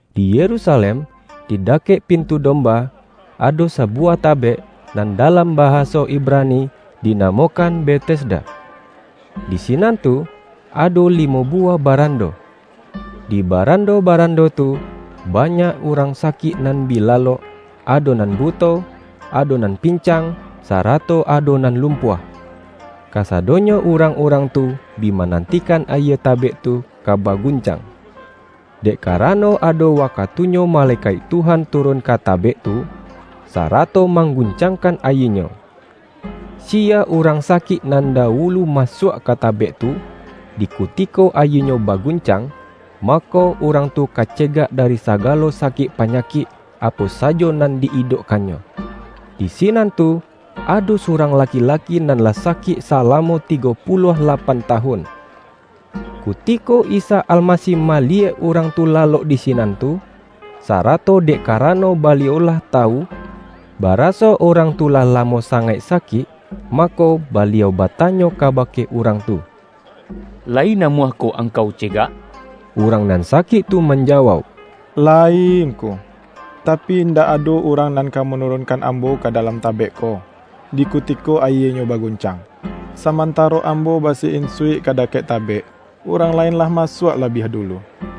Di Yerusalem, di da-kek”Pintu Domba,” ado sabuwah ta-bek, nan dalam bahaso Ibrani dina-mokan Betesda. Di sinan tu ado limo buwah barando. Di barando-baran-do tu, banyak urang sakik nan bi la-lok, ado nan buto, ado nan pincang, sarato ado nan lumpuah. [Kasadonyo urang-urang tu bi manantikan ayie tabek tu ka baguncang. Dek karano ado wakatunyo malekaik Tuhan turun ka tabek tu, sarato mangguncangkan ayienyo. Siya urang sakik nan dawu-lu masuak ka tabek tu, di kutiko ayie-nyo baguncang, mako urang tu ka cegak dari sagalo sakik panyakik apo sajo nan di-idokkannyo.] Di sinan tu, ado surang laki-laki nan lah sakik sa-lamo tigo puluah lapan tawun. Kuti-ko Isa Almasih maliyek urang tu lalok di sinan tu, sarato dek karano Baliau lah tawu, baraso urang tu lah lamo sangaik sakik, mako, Baliau batanyo kabake urang tu,”Layi namuahkoh angkau cegak?” Urang nan sakik tu manjawauk,”Layi Ngku, tapi indak ado urang nan ka manurunkan ambo ka dalam ta-bek ko, di kutiko ayienyo baguncang. Samantaro ambo basi-insuik ka da-kek tabek, urang lain lah masuak la-biah dulu.”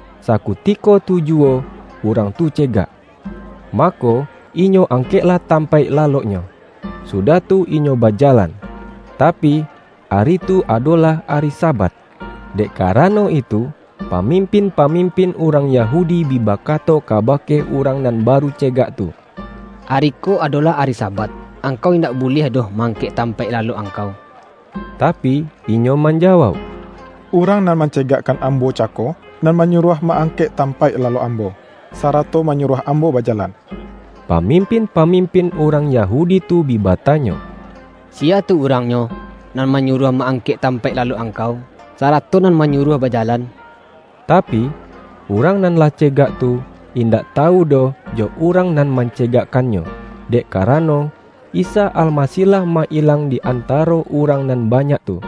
Sakutiko tu juwo urang tu cegak. Ma-ko, inyo angkeklah tampaik laloknyo, sudah tu inyo bajalan. Tapi, ari tu adolah Ari Sabat. Dek karano itu, pamimpin-pamimpin urang Yahudi bi bakato kabake urang nan ba-ru cegak tu,”Ari ko adolah ari Sabat. Angkau indak buliah doh ma-angkek tampaik lalok angkau.” Tapi, inyo manjawauk,”Urang nan mancegakkan ambo cako nan manyu-ruah ma-angkek tampaik lalok ambo, sarato manyuruah ambo bajalan.” Pamimpin-pamimpin urang Yahu-di tu bi batanyo,”Siya tu urangnyo, nan manyuruah ma-angkek tampaik lalok angkau, sarato nan manyuruah bajalan?” Tapi, urang nan lah cegak tu, indak tawu doh jo urang nan mancegakkan-nyo, dek karano, Isa Almasih lah ma-ilang di antaro urang nan banyak tu.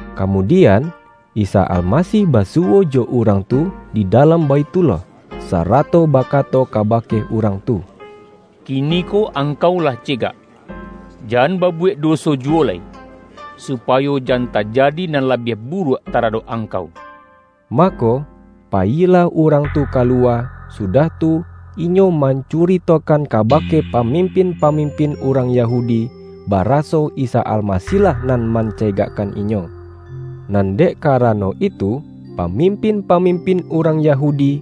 Kamudian, Isa Almasih basuwo jo urang tu di dalam Baithullah, sa-rato bakato kabake urang tu,”Kiniko angkau lah cegak. Jan babuwek doso juwo lai, supayo jan tajadi nan labiah buruak taradok angkau.” Mako, payilah urang tu kaluwa, sudah tu, inyo mancuritokan kaba-ke pamimin-pamimpin urang Yahu-di, baraso Isa Almasih-lah nan man-cegakkan inyo. Nan dek karano itu, pamimpin-pamimpin urang Yahudi,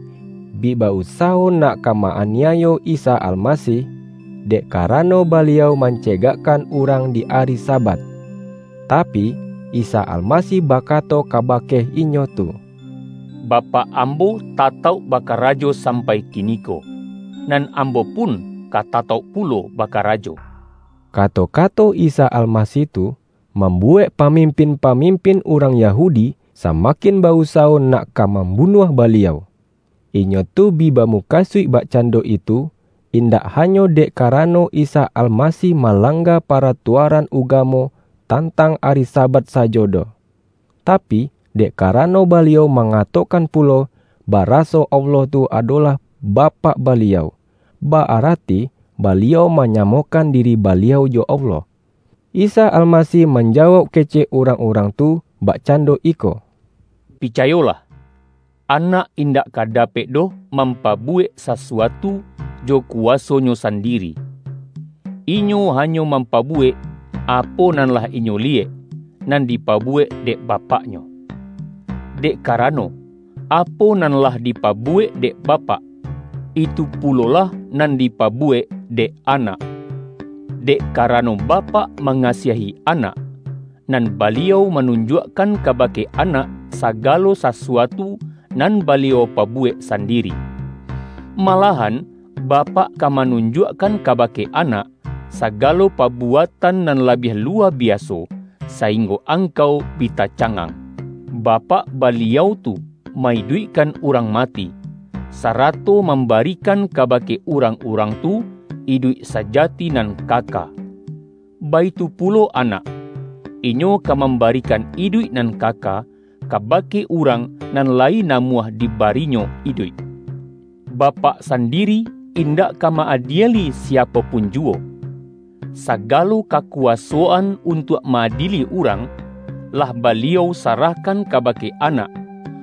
bi ba-usawo nak ka ma-aniayo Isa Almasih, dek karano Baliau mance-gakkan urang di ari Sabat. Tapi, Isa Almasih bakato kabake inyo tu,”Bapak Ambo tatauk bakarajo sampai kiniko, nan Ambo pun ka tatauk pulo bakarajo.” Kato-kato Isa Almasih tu, mambu-wek pamimpin-pamimpin urang Ya-hudi samakin ba-usawo nak ka mam-bunuah Baliau. Inyo tu bi bamukasuik bakcando itu, indak hanyo dek ka-rano Isa Almasih malangga paratua-ran ugamo tantang ari Sabat sajo doh, tapi, dek karano Baliau mangatokan pulo, baraso Allah tu adolah Bapak Baliau, ba-arati Baliau manyamokan diri Baliau jo Allah. Isa Almasih manjawauk kecek urang-urang tu bakcando iko,”Pica-yolah, Anak indak ka dapek doh mam-pabuwek sasuatu jo kuwaso-Nyo san-diri. Inyo hanyo mampabuwek, apo nan lah Inyo liyek, nan dipabuwek dek Bapak-Nyo. Dek karano, apo nan lah dipabuwek dek Bapak, itu pulo-lah nan dipabuwek dek Anak. Dek karano Bapak mangasiahi Anak, nan Baliau manunjuakkan kabake Anak sagalo sasuatu nan Baliau pabuwek sandiri. Malahan Bapak ka manun-juakkan kabake Anak, sagalo pabu-atan nan labiah luwa biaso, saing-go angkau bi tacangang. Bapak, Baliau tu ma-iduikkan urang mati, sa-rato mambarikan kabake urang-urang tu iduik sajati nan kaka. Baitu pulo Anak, Inyo ka mambarikan iduik nan kaka, kabake urang nan lai namuah dibari-Nyo iduik. Bapak sandiri indak ka ma-adieli siapo pun juwo. Sa-galo kakuwasoan untuak ma-adieli urang, lah Baliau sarahkan kabake Anak,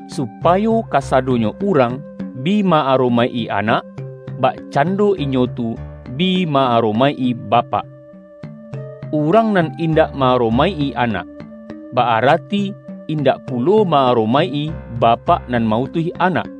supayo kasadonyo urang bi ma-aromaik-i Anak, bakcando inyo tu bi ma-aromaik-i Bapak. Urang nan in-dak ma-aromaik-i Anak, ba-arati in-dak pulo ma-aromaik-i Bapak nan ma-utuih Anak.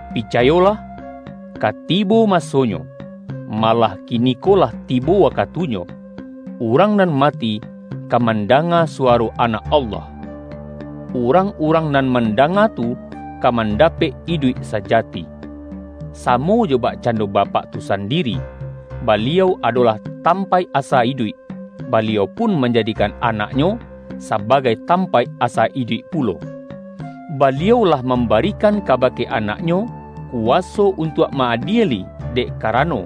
Picayolah: Ka tibo masonyo — malah kiniko lah tibo wakatunyo — urang nan mati ka mandanga suwa-ro Anak Allah. Urang-urang nan man-danga tu ka mandapek iduik sajati. Samo jo bakcando Bapak tu sandiri, Baliau adolah tampaik asa iduik, Baliau pun manjadikan Anak-Nyo, sabagai tampaik asa iduik pulo. Baliau lah mambarikan kabake Anak-Nyo, kuwa-so untuak ma-adieli, dek karano,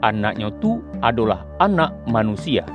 Anak-Nyo tu adolah Anak Manusia.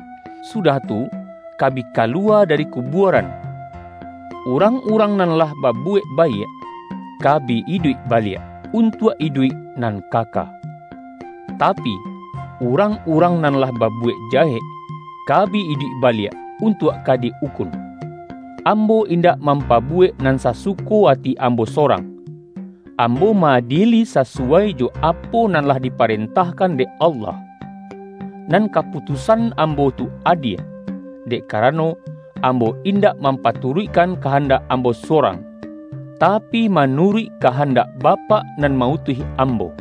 sudah tu ka bi kaluwa dari kubuaran. Urang-urang nan lah babuwek baiak, ka bi iduik baliak, untuak iduik nan kaka. Tapi, urang-urang nan lah babuwek jahek, ka bi iduik baliak, untuak ka di-ukun.” ”Ambo indak mampabuwek nan sasuko ati Ambo sorang. Ambo ma-adieli sasuwai jo apo nan lah dipa-rentahkan dek Allah. Nan kaputus-an Ambo tu adie, dek karano, Ambo indak mampaturuikkan kahandak Ambo sorang, tapi, manuruik kahan-dak Bapak nan ma-utuih Ambo.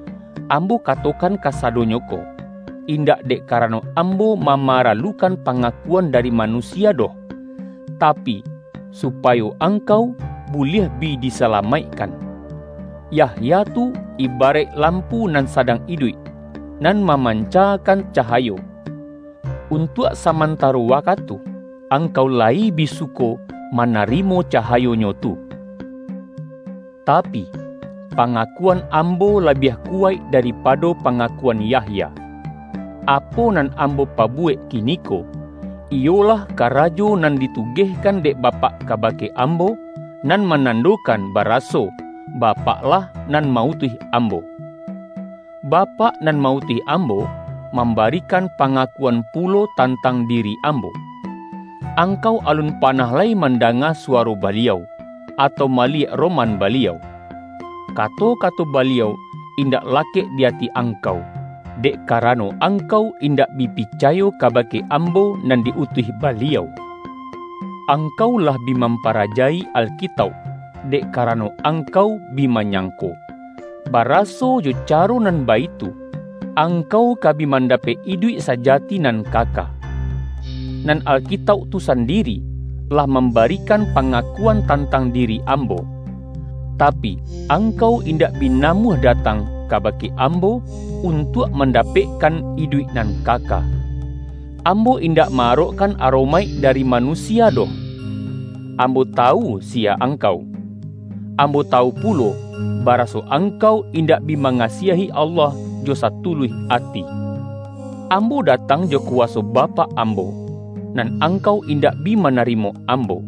Ambo ka-tokan kasadonyo ko, indak dek karano Ambo mamaralukan pangakuan da-ri manusia doh, tapi, supayo angkau buliah bi disalamaikkan. Yahya tu ibaraik lampu nan sadang iduik, nan mamancakan cahayo. Untuak saman-taro wakatu, angkau layi bi suko ma-narimo cahayonyo tu. Tapi, panga-kuan Ambo labiah kuwaik daripado pangakuan Yahya. Apo nan Ambo pa-buwek kiniko, iyolah karajo nan ditu-gehkan dek Bapak kabake Ambo, nan manandokan baraso Bapak-lah nan ma-utuih Ambo. Bapak nan ma-utuih Ambo, mambarikan pangakuan pulo tantang diri Ambo. Angkau alun pa-nah lai mandanga suwaro Baliau, atau maliyek roman Baliau. Kato-kato Baliau indak lakek di ati angkau, dek karano angkau indak bi picayo kaba-ke Ambo nan di-utuih Baliau. Ang-kau lah bi mamparaja-i Alkitauk, dek karano angkau bi manyangko, bara-so jo caro nan baitu, angkau ka bi mandapek iduik sajati nan kaka. Nan Alkitauk tu sandiri, lah mambarikan pangakuan tantang diri Ambo. Tapi, angkau indak bi namuah datang kaba-ke Ambo, untuak mandapekkan iduik nan kaka. Ambo indak ma-arokkan aromaik dari manusia doh. Ambo tawu siya angkau. Ambo tawu pulo, baraso angkau indak bi mangasiahi Allah jo satuluih ati. Ambo datang jo kuwaso Bapak Ambo, nan angkau indak bi manarimo Ambo.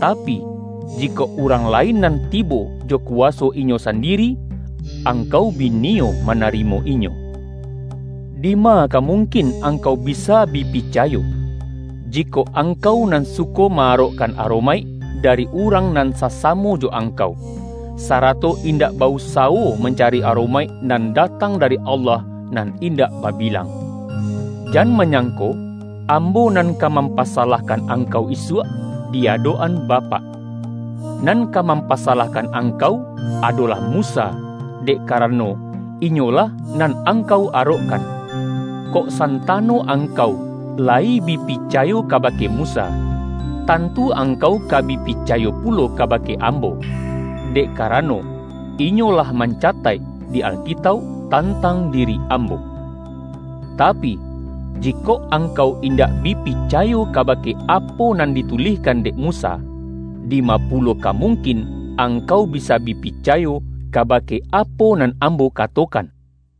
Tapi, jikok urang lain nan tibo jo kuwaso inyo sandiri, angkau bi niyo manarimo inyo. Dima ka mungkin angkau bisa bi picayo, jikok angkau nan suko ma-arokkan aromaik dari urang nan sasamo jo angkau, sarato indak ba-usawo mancari aromaik nan datang dari Allah nan indak babilang? Jan manyangko, Ambo nan ka mampasa-lahkan angkau isuak di adok-an Ba-pak. Nan ka mampasalahkan angkau adolah Musa, dek karano inyolah nan angkau arokkan. Kok santano ang-kau layi bi picayo kabake Musa, tantu angkau ka bi picayo pulo kabake Am-bo, dek karano, inyo lah mancataik di Alkitauk tantang diri Ambo. Tapi, ji-kok angkau indak bi picayo kabake apo nan ditulihkan dek Musa, dima pulo ka mungkin angkau bisa bi picayo, kaba-ke apo nan Ambo katokan?” YAHYA